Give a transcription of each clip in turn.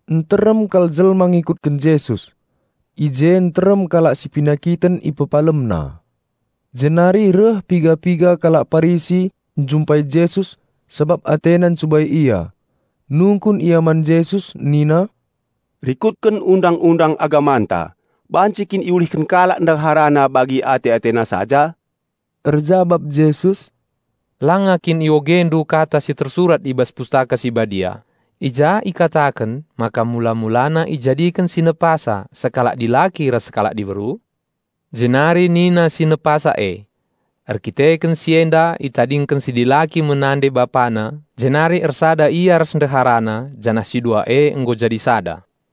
Nterem kal jelma ngikutken Jesus. I je nterem kalak si penakiten IpepalemNa. Jenari reh piga-piga kalak Parisi njumpai Jesus sabap atena ncubai Ia. Nungkun ia man Jesus nina, "Rikutken Undang-undang agamanta banci kin iulihken kalak ndeharana bagi ate-atena saja?" Erjabap Jesus, "Langa kin iogendu kata si tersurat i bas Pustaka Si Badia, i ja ikataken maka mula-mulana ijadiken si Nepasa sekalak dilaki ras sekalak diberu? Jenari nina si Nepasa e, 'Erdandanken si enda itadingken si dilaki me nande-bapana jenari ersada ia ras ndeharana janah si dua e nggo jadi sada.'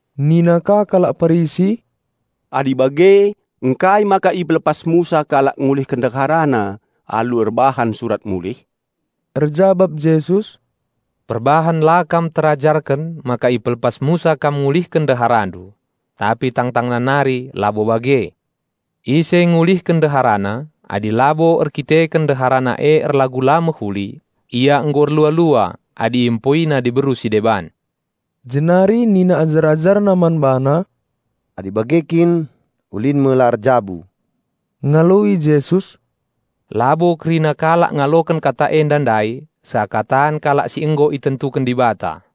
Nina ka kalak Parisi, "Adi bage, ngkai maka ipelepas Musa kalak ngulihken ndeharana alu erbahan surat mulih?" Erjabap Jesus, "Perbahan la kam terajarken maka ipelepas Musa kam ngulihken ndeharandu. Tapi tang-tangna nari labo bage. Ise ngulihken ndeharana, adi labo erkiteken ndeharana e erlagu la mehuli, ia nggo erlua-lua adi iempoina diberu si deban." Jenari nina ajar-AjarNa man BaNa, "Adi bage kin, ulin me la erjabu." Ngaloi Jesus, "Labo kerina kalak ngaloken kata enda ndai, seakatan kalal si nggo itentuken Dibata.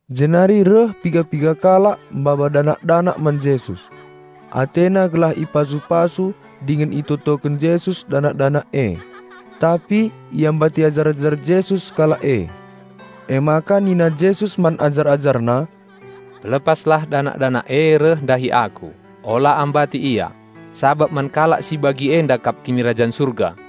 Jenari reh piga-piga kalak maba danak-danak man Jesus. Atena gelah ipasu-pasu dingen itotoken Jesus danak-danak e. Tapi iambati ajar-ajar Jesus kalak e. Emaka nina Jesus man ajar-AjarNa, "Pelepaslah danak-danak e reh ndahi Aku, ola ambati ia, sabap man kalak si bagi enda kap Kinirajan Surga."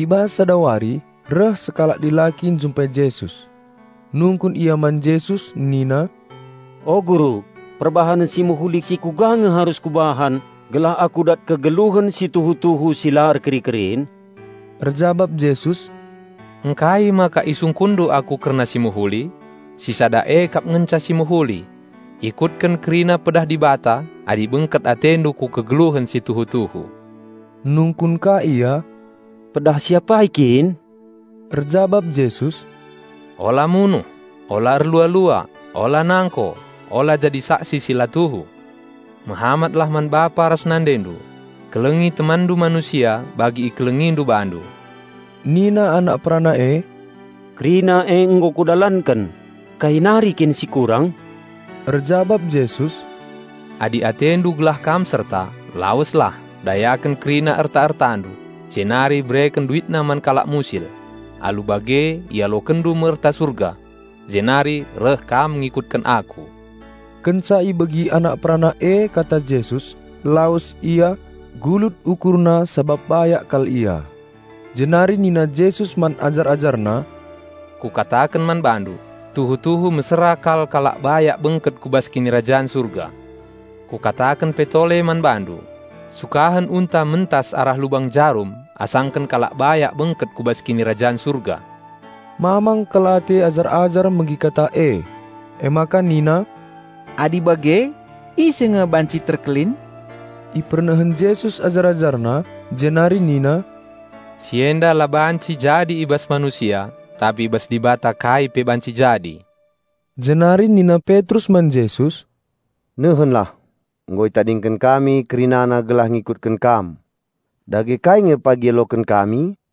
I bas sada wari, reh sekalak dilaki njumpai Jesus. Nungkun ia man Jesus nina, "O Guru, perbahanen si mehuli si kuga nge arus kubahan gelah kudat kegeluhen si tuhu-tuhu si la erkeri-kerin?" Erjabap Jesus, "Ngkai maka isungkunndu Aku kerna si mehuli? Si sada e kap ngenca si mehuli. Ikutken kerina pedah Dibata adi bengket atendu ku kegeluhen si tuhu-tuhu." Nungkun ka ia, "Pedah si apai kin?" Erjabap Jesus, "Ola munuh; ola erlua-lua; ola nangko; ola jadi saksi si la tuhu; mehamatlah man bapa ras nandendu; kelengi temanndu manusia bagi ikelengindu bandu." Nina anak perana e, "Kerina e nggo kudalanken. Kai nari kin si kurang?" Erjabap Jesus, "Adi atendu gelah kam serta, laweslah, dayaken kerina erta-ertandu, jenari bereken duitna man kalak musil, alu bage ialokenndu me erta surga; Jenari reh kam ngikutken Aku." Kenca ibegi anak perana e kata Jesus, lawes ia, gulut ukurna sabap bayak kal ia. Jenari nina Jesus man ajar-AjarNa, "Kukataken man bandu: Tuhu-tuhu mesera kal kalak bayak bengket ku bas Kinirajan Surga. Kukataken pe tole man bandu: sukahen unta mentas arah lubang jarum asangken kalak bayak bengket ku bas Kinirajan Surga." Mamang kal ate ajar-ajar megi kata e, emaka nina, "Adi bage, ise nge banci terkelin?" Ipernehen Jesus ajar-AjarNa, jenari nina, "Si enda la banci i bas manusia, tapi i bas Dibata kai pe banci jadi." Jenari nina Petrus man Jesus, "Nehenlah, nggo itadingken kami kerinana gelah ngikutken Kam. Dage kai nge pagi ialoken kami?"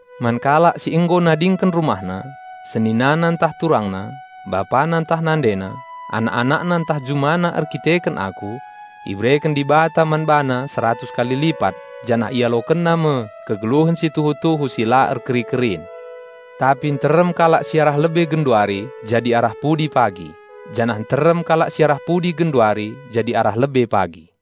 Man kalak si nggo nadingken rumahna, seninana ntah turangna, bapana ntah nandena, anak-anakna ntah jumana erdandanken Aku, ibereken Dibata man bana seratus kali lipat janah ialokenna me kegeluhen si tuhu-tuhu si la erkeri-kerin. Tapi nterem kalak si arah lebe genduari jadi arah pudi pagi, janah nterem kalak si arah pudi genduari jadi arah lebe pagi."